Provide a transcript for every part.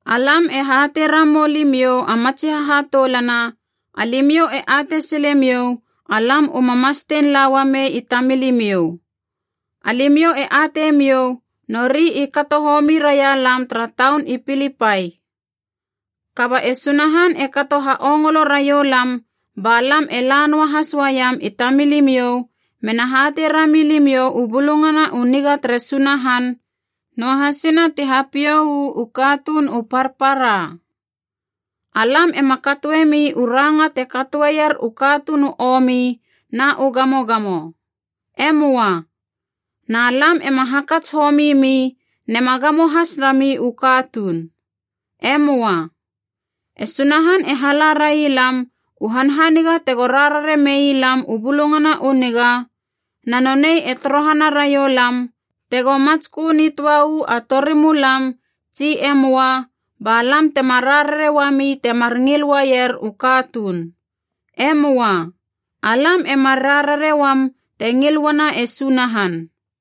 Alam e hatei ramou limiou a matsi hahatoulana, alimiou e atei silemiou alam u ma mastein la uamei i tamilimiou. Alimiou e atei miou, nori i kato homi raia lam tara taun i Pilipai. Kaba e Sunahan e kato ha ongolo raioulam ba lam e la noahas uaiem i tamilimiou mena hatei rami limiou u Bulungana u Niga tere Sunahan, noahasina ti hapiou u katuun u parpara. Alam ema katoemi u ranga te katoeier u katuun u omi na u gamogamo. E möa. Na lam ema hakats homi mi nema gamo has rami u katuun. E möa. E Sunahan e hala railam u hanhaniga tego rarare mei lam u Bulungana u Niga, na nonei e torohana raiou lam, tego matskö nitöa uu a torimulam tsi e möa, ba lam tema rarare uami temar ngil uaier u katuun. E möa. Alam e mar rarare uam te ngil uana e Sunahan.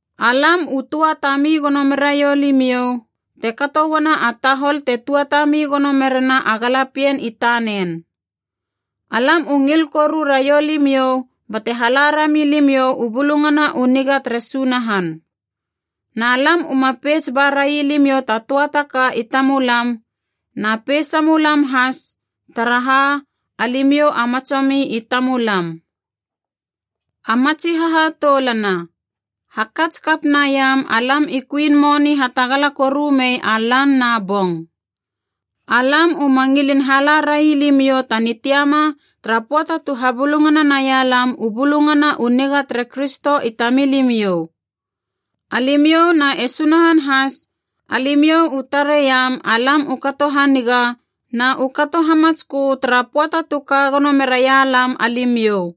Alam u tuatami gono meraiou limiou, te kato uana a tahol te tuatami gono merena a galapien i tanen. Alam u ngil koru raiou limiou bate hala rami limiou u Bulungana u Niga tere Sunahan. Na lam uma peits ba railimiou ta töa taka i tamulam, na peisamulam has, taraha alimiou a matsomi i tamulam. A matsi hahatoulana, hakats kap naiam alam i kuin moni hatagala koru mei a lan na bong. Alam uma ngilin hala railimiou ta nitiama tara pöata tu habulungana nailam u Bulungana U Niga tere Kristo i tamilimiou. Alimiou na e Sunahan has, alimiou u tareiam alam u kato haniga na u kato hamatskö tara pöata tu ka gono meraia lam alimiou.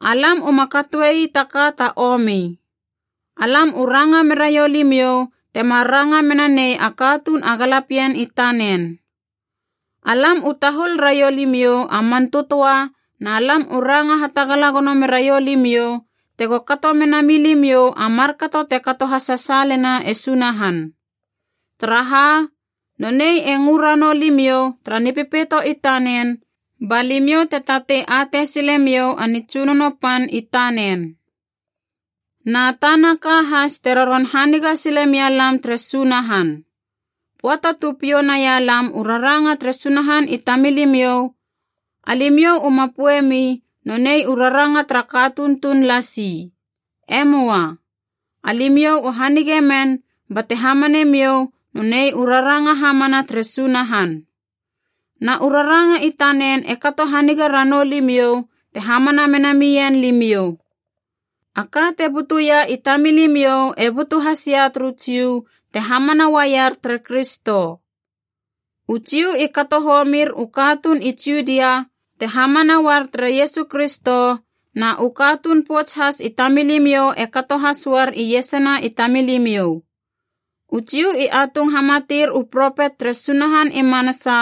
Alam uma katoei taka ta omi. Alam u ranga meraiou limiou temar ranga mena nei a katuun a galapien i tanen. Alam u tahul raiou limiou a man tötöa na lam u ranga hatagala gono meraiou limiou tego kato mena milimiou a markato te kato hasasaalena e Sunahan. Taraha, nonei e ngö ranou limiou tara Nipepeito i tanen ba limiou te tatei atei silemiou a nitsunono pan i tanen. Na tana ka has te roron haniga sile mia lam tere Sunahan. Pöata tu piou naia lam u raranga tere Sunahan i tamilimiou, alimiou u ma poeiemi nonei u raranga tara katuun tuun lasi. E möa. Alimiou u hanige men bate hamanemiou nonei u raranga hamana tere Sunahan. Na u raranga i tanen e kato haniga ranou limiou te hamana mena mien limiou. A ka te butuia i tamilimiou e butu hasia turu Jiu te hamana uaier tere Kristo. U Jiu i kato homir u katuun i Judia te hamana uar tere Iesu Kristo, na u katuun pouts has i tamilimiou e kato has uar iesana i tamilimiou. U Jiu i atung hamatir u propet tere Sunahan i manasa,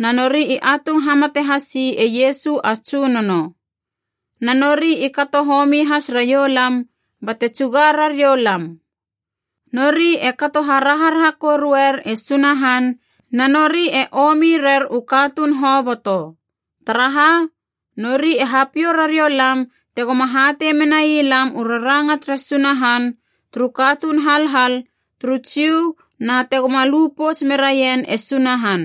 na nori i atung hamate hasi e Iesu a Tsunono. Na nori i kato homi has raioulam bate tsuga rariou lam. Nori e kato haraharaha koruer e Sunahan na nori e omi rer u katuun hoboto. Taraha, nori e hapiou rariou lam tegoma hatei menai lam u raranga tere Sunahan turu katuun halhal turu Jiu na tegoma lu pouts meraien e Sunahan.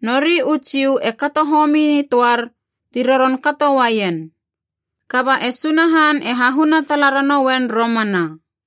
Nori u Jiu e kato homi nitöar, ti roron kato uaien. Kaba e Sunahan e hahuna tala ranouen romana.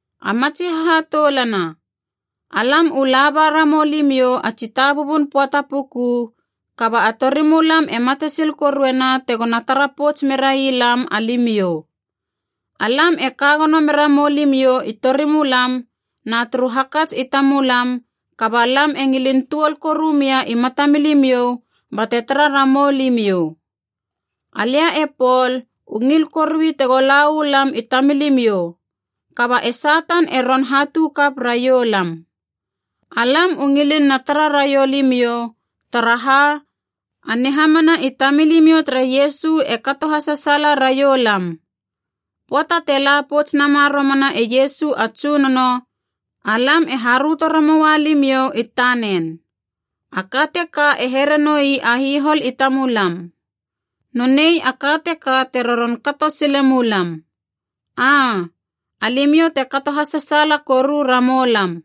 A matsi hahatoulana, alam u laba ramou limiou a tsitabubun pöata puku, kaba a torimulam e matesil koruena tegona tara pouts merai lam, alimiou. Alam e kagono mera mou limiou i torimulam na turu hakats i tamulam kaba lam e ngilin tuol koru mia i matamilimiou bate tara ramou limiou. Alia e Pol u ngil korui tego la uu lam i tamilimiou, kaba e Satan e roron hatu kap raiou lam. Alam u ngilin na tara raiou limiou, taraha a nihamana i tamilimiou tere Iesu e kato hasasaala raiou lam. Pöata te la pouts nama romana e Iesu a Tsunono, alam e haröto ramoua limiou i tanen. A ka teka e here noi a hihol i tamulam. Nonei a ka teka te roron kato sile mulam. Aa, alimiou te kato hasasaala koru ramou lam.